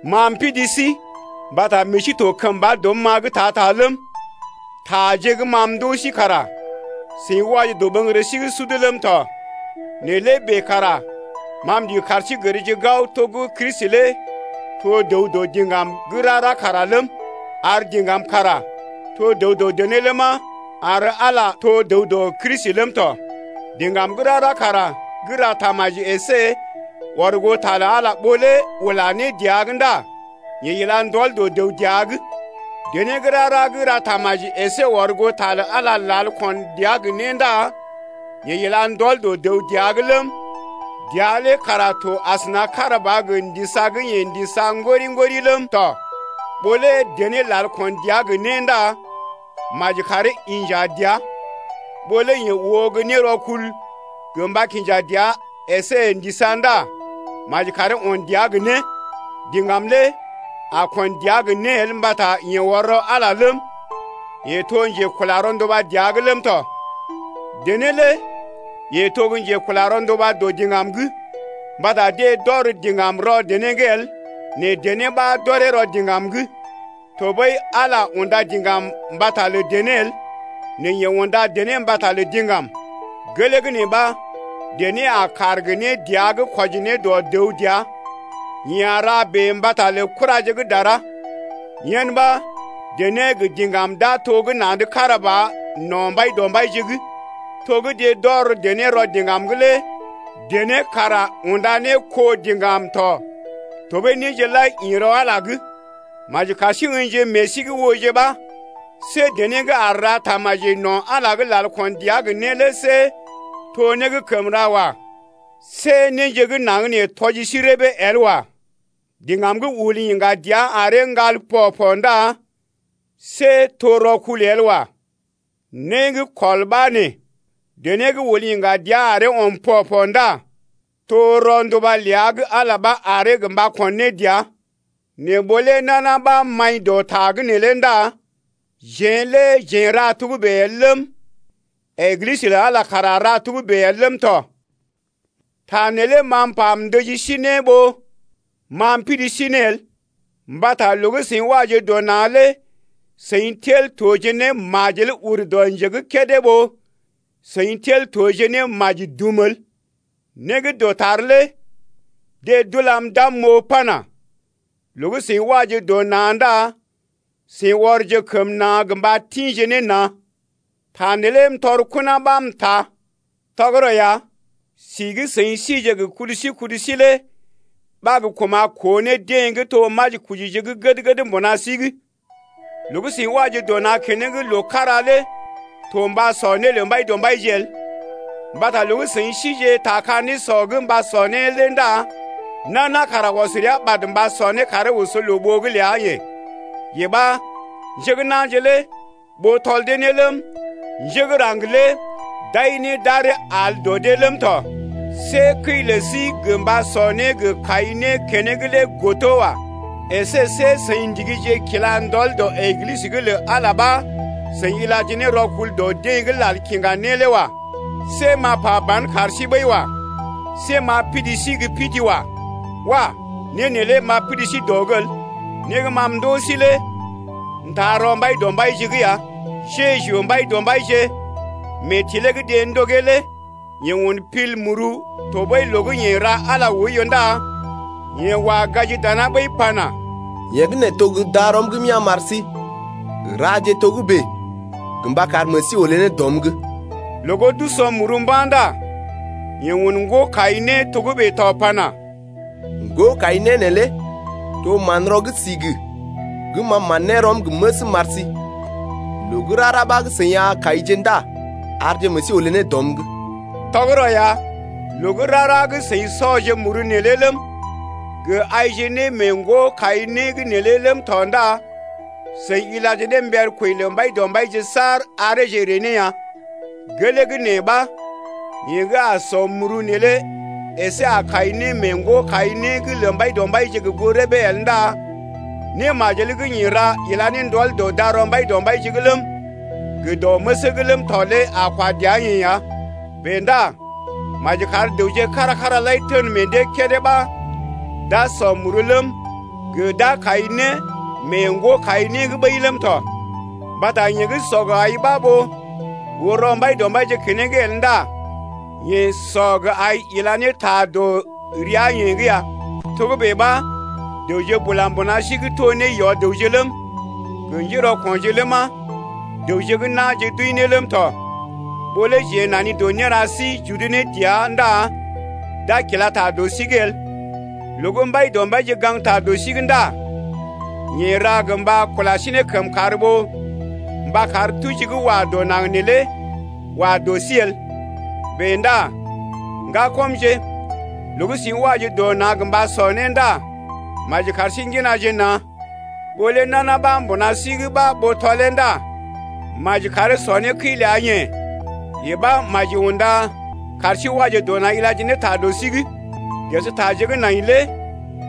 Ma m’pidi sí mbata meḛ sí to kəmba dɔm-ma’g ta-ta ləm, taje gə́ ma m’ndoo sí kara seḭ waje dɔɓəŋgərə sí’g sud ləm tɔ. Nɛ lé bèe kara ma m’ndigi kar sí gərje gao to gə́ Kristi lé to dəw dɔ diŋgam gə́ rara kara ləm, ar diŋgam kara to dəw dɔ dené ləma, ar Ala to dəw dɔ Kristi ləm tɔ. Diŋgam gə́ rara kara gə́ ra tamaji əsé ɔr goo ta lə Ala ɓó lé ula né dəa’g ndá yeḛ ila ndɔl dɔ dəw dəa’g. Dené gə́ rara gə́ ra tamaji əsé ɔr goo ta lə Ala lal ko̰ dəa gə né ndá yeḛ ila ndɔl dɔ dəw dəa’g ləm, dəa lé kara to asəna kára ba gə ndisa gə́ yeḛ ndisa ŋgori-ŋgori ləm tɔ. Ɓó lé dené lal kon dəa gə́ né ndá maji karee inja dəa. Ɓó lé yeḛ oo gə́ nérɔkul gə mba kinja dəa əsé ndisa ndá maji karee on dəa gə né. Diŋgam lé a kon dəa gə né el mbata yeḛ ɔr rɔ Ala ləm, yeḛ to njekula rɔnduba dəa’g ləm tɔ. Dené lé yeḛ to gə́ njekula rɔnduba dɔ diŋgam’g. Mbata deḛ d’ɔr diŋgam rɔ dené’g el nɛ dené ɓa d’ɔree rɔ diŋgam’g. Tɔɓəi Ala unda diŋgam mbata lə dené el nɛ yeḛ unda dené mbata lə diŋgam. Gelee gə́ nee ɓa, dené a kaar gə né dəa’g kwɔji ne dɔ dəw dəa, yeḛ a ra bèe mbata lə kuraje gə́ dara. Yen ɓa, dené gə diŋgam d’a to gə́ na̰’d kára ba no̰ Mbaidɔmbaije’g. To gə́ deḛ d’ɔr dené rɔ diŋgam’g lé dené kara unda ne kó diŋgam tɔ tɔɓəi néje lai ḭ rɔ Ala’g lé. Maji kar sí ə̰jije meḛ sí’g ooje ɓa, see dené gə́ aar ra tamaji no̰ Ala’g lal kon dəa gə né lé see to né gə́ kəm ra wa. See néje gə́ naŋg nee tɔji sí rəbee el wa. Diŋgam gə́ ul yiŋga dəa aree ŋgal pɔ-pɔ ndá see to rɔkul el wa. Né gə́ kɔl ɓa nee: dené gə́ ul yiŋga dəa aree ɔm pɔ-pɔ ndá to rɔnduba ləa gə́ Ala ɓa aree gə mba kon ne dəa. Nɛ ɓó lé nana ɓa maḭ dɔ ta’g neelé ndá jeḛ lé jeḛ n’ra togə́bè el ləm, Eglisə lə Ala kara ra togə́bè el ləm tɔ. Ta neelé ma m’pa m’ndəji sí ne ɓó ma m’pidi sí ne el, mbata loo gə́ seḭ waje dɔ na̰ lé seḭ tel toje ne majel ur dɔ nje gə́ kédé ɓó seḭ tel toje ne maji dum el. Né gə́ dɔtar lé deḛ d’ulam d’am m’oo pana: Loo gə́ seḭ waje dɔ na̰ ndá seḭ ɔrje kəm na̰ gə mba tḭje ne na̰. Ta neelé m’tɔr kona ɓa m’taa. Tɔgərɔ ya, si gə́ seḭ sije gə kudu sí kudu sí lé ɓa gə́ kuma̰ koo ne deḛ gə́ to gə́ majikojije gəd-gəd mbuna sí’g. Loo gə́ seḭ waje dɔ na̰ keneŋ loo kára lé to mba sɔ né lə Mbaidɔmbaije el, mbata loo gə́ seḭ sije ta ka nésɔ’g mba sɔ né lé ndá nana kara ɔs rəa ɓad mba sɔ né karee oso loo-ɓoo’g ləa-yeḛ, yee ɓa njé gə́ na̰je lé ɓoo tɔl dee ne ləm, njé gə́ raŋg lé d’ai né d’aree al dɔ dee ləm tɔ. See kəi lə sí gə mba sɔ né gə kai né keneŋ lé godo wa. Esé see seḭ ndigije kila ndɔl dɔ Eglisə’g lə Ala lé ɓa seḭ ilaje ne rɔkul dɔ dee gə́ lal kiŋga né lé wa. See m’a pa ban kar sí ɓəi wa. See m’a pidi sí gə́ pidi wa. Wah! Né neelé m’a pidi sí dɔ’g el. Né gə́ ma m’ndoo sí lé m’taa rɔ Mbaidɔmbaije’g ya: Jeju Mbaidɔmbaije, mee tilee gə́ deḛ ndogee’g lé yeḛ un pil muru tɔɓəi loo gə́ yeḛ ra Ala lé oiyo ndá yeḛ wa gaji dana ɓəi pana: Yee gə́ nee to gə́ darɔm gə́ m’ya̰ m’ar sí. Raje togə́bè gə mba kar meḛ sí olé ne dɔm’g. Loo gə́ d’o̰ muru mba̰ ndá yeḛ un ŋgo-kai-né togə́bè tɔ pana: Ŋgo-kai-né neelé to manrɔ gə́ sigi gə́ ma man ne rɔm gə məsm m’ar sí. Loo gə́ rara ɓa gə́ seḭ a kaije ndá arje meḛ sí olé ne dɔm’g. Tɔgərɔ ya, loo gə́ rara gə́ seḭ o̰ muru neelé ləm, gə aije ne mee ŋgo-kai-né’g neelé ləm tɔ ndá seḭ ilaje ne mber kwəi lə Mbaidɔmbaije saar areeje ree ne ya. Gelee gə́ nee ɓa yeḛ gə́ a ko̰ muru neelé əsé a kai né mee ŋgo-kai-né’g lə Mbaidɔmbaije gə goo rəbee el ndá némajel gə́ yeḛ ra ila ne ndɔl dɔ darɔ Mbaidɔmbaije’g ləm gə dɔ məsee’g ləm tɔ lé a kwa dəa-yeḛ ya. Bèe ndá maji kar dəwje kára-kára lai tən meḛ dee kédé ɓa d’a ko̰ muru ləm, gə d’a kai né mee ŋgo-kai-né’g ɓəi ləm tɔ, mbata yeḛ gə́ o̰ gə ai ɓa ɓó oo rɔ Mbaidɔmbaije keneŋ el ndá yeḛ o̰ gə ai ila ne ta dɔ rəa-yeḛ’g ya. Togə́bè ɓa dəwje bula mbuna sí’g to ne yɔ-dəwje ləm, gə njérɔko̰je ləma, dəwje gə́ na̰je d’wəi ne ləm tɔ. Ɓó lé jeḛ nani dɔ néra sí j’udu ne dəa ndá d’a kila ta dɔ sí’g el. Loo gə́ Mbaidɔmbaije gaŋgta dɔ sí’g ndá yeḛ ra gə mba kula sí ne kəmkàr ɓó mba kar tuji gə́ wa dɔ naŋg neelé wa dɔ sí el. Bèe ndá ŋgakɔmje, loo gə́ seḭ waje dɔ naŋg gə mba sɔ né ndá maji kar sí ŋginaje na̰. Ɓó lé nana ɓa mbuna sí’g ɓa ɓoo tɔlee ndá maji karee sɔ né kəi ləa-yeḛ, yee ɓa maji unda kar sí waje dɔ na̰ ilaje ne ta dɔ sí’g. Ges taje gə́ nai lé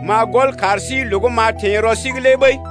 m’a gɔl kar sí loo gə́ m’a teḛ rɔ sí’g lé ɓəi.